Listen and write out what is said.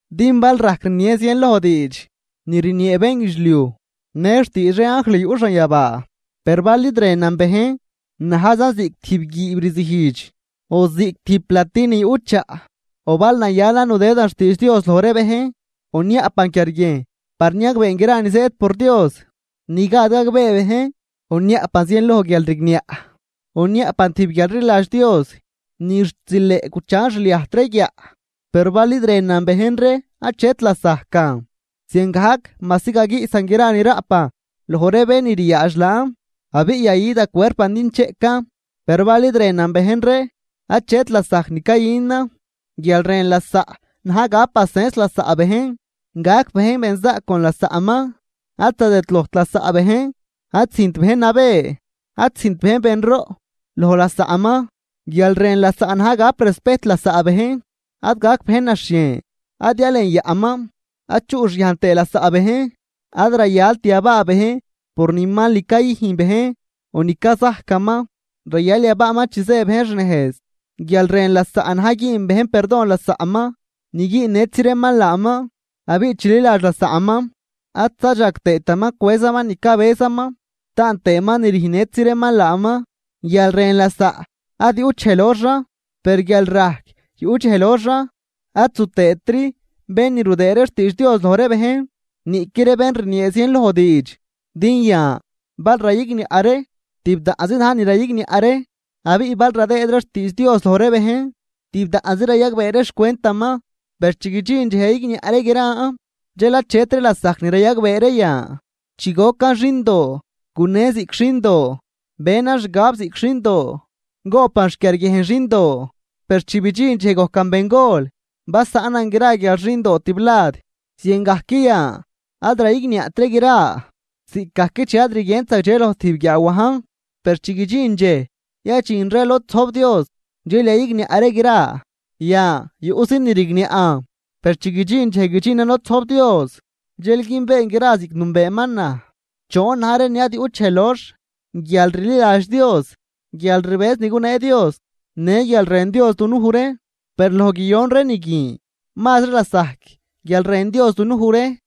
Din bal rajc rnien zienloj diidx ni rniee bénguidxliuj në xtiidx ree anjl yuꞌ xanyabaa, per bal id rënan bejn najzan ziꞌc tijb guiib rzijdx o ziꞌc tijb plati ni yuꞌ chaꞌ. O bal nayalan nudëdan xtiidx Dios loj ree bejn, o niaꞌpan quiarguiejn par niagbeen gra ni zëëd por Dios ni gad gagbee bejn, o niaꞌpan zienloj guialrigniaꞌ o niaꞌpan tijb guialrliladx Dios ni xt zileꞌ guchan xliajt ree guiaꞌ, per bal id rënan bejn ree achet lasajcan. Ziangajc majsi gaguiꞌsan gra ni raꞌpan loj ree bén ni ryaadx laan abiꞌ yayü da cuerpan din cheꞌcan, per bal id rënan bejn ree achet lasajc ni cayünan. Guial rën lasaꞌ na̱j gap pacens lasaꞌ bejn, gac bejn benzaꞌc con lasaꞌman, ad zadëdlojt lasaꞌ bejn, ad züjnt bejn nabë, ad züjnt bejn benroꞌ loj lasaꞌman. Guial rën lasaꞌ na̱j gap respejt lasaꞌ bejn, ad gac bejn naxhien, ad yalenyaꞌman, ad chuꞌxyajn tëë lasaꞌ bejn, ad rayalt yabaa bejn por ni mal ni cayüjn bejn o ni cazajcaman, rayal yabaaman chi zë bejn xnejz. Guial rën lasaꞌ na̱j güün bejn perdon lasaꞌman ni güünnëtzi reeman laaman, abiꞌ chililadx lasaꞌman, ad zadxag tëëtaman cwëzaman ni cabëzaman, taan tëëman ni rüjnnëtzi reeman laaman. Guial rën lasaꞌ ad yuꞌt dxej loxan, per guialrajc yuꞌ dxej loxan, ad zu tëëtri bén ni rudëëd ree xtiidx Dios loj ree bejn niꞌqui ree bén rniee zienloj diidx. Din yan bal rayigniaꞌ ree, tibdaꞌnzi na̱j ni rayigniaꞌ ree abiꞌ bal radëëd ree xtiidx Dios loj ree bejn, tibdaꞌnzi rayagbee ree xcwentaman. Per chi guidxin dxej yayigniaꞌ ree gran, dxel achetri lasajc ni rayagbee ree yan. Chi gocan xindoo gunen ziꞌc xindoo, benan xgab ziꞌc xindoo, goꞌpan xquiarguiejn xindoo. Per chi bidxin dxej gojcan bengol basaꞌnan gra guial xindoo tiblad. Ziangajc yan ad rayigniaꞌt ree gra ziꞌcgajc chi ad rguient zagdxe loj tijb guiaawajn, per chi guidxin dxej yadxin ree lod zojb Dios dxel yayigniaꞌ ree gra. Yan yuꞌzi ni rigniaꞌn per chi guidxin dxej guidxinan lod zojb Dios dxel günbeen gra ziꞌc nünbeeman naj. Choon na̱j ree ni ad yuꞌt dxej lox, guialrliladx Dios, guialrbëz ni gunee Dios, në guial rën Dios dunuj ree. Per loj guiyon ree ni guin mazri lasajc guial rën Dios dunuj ree.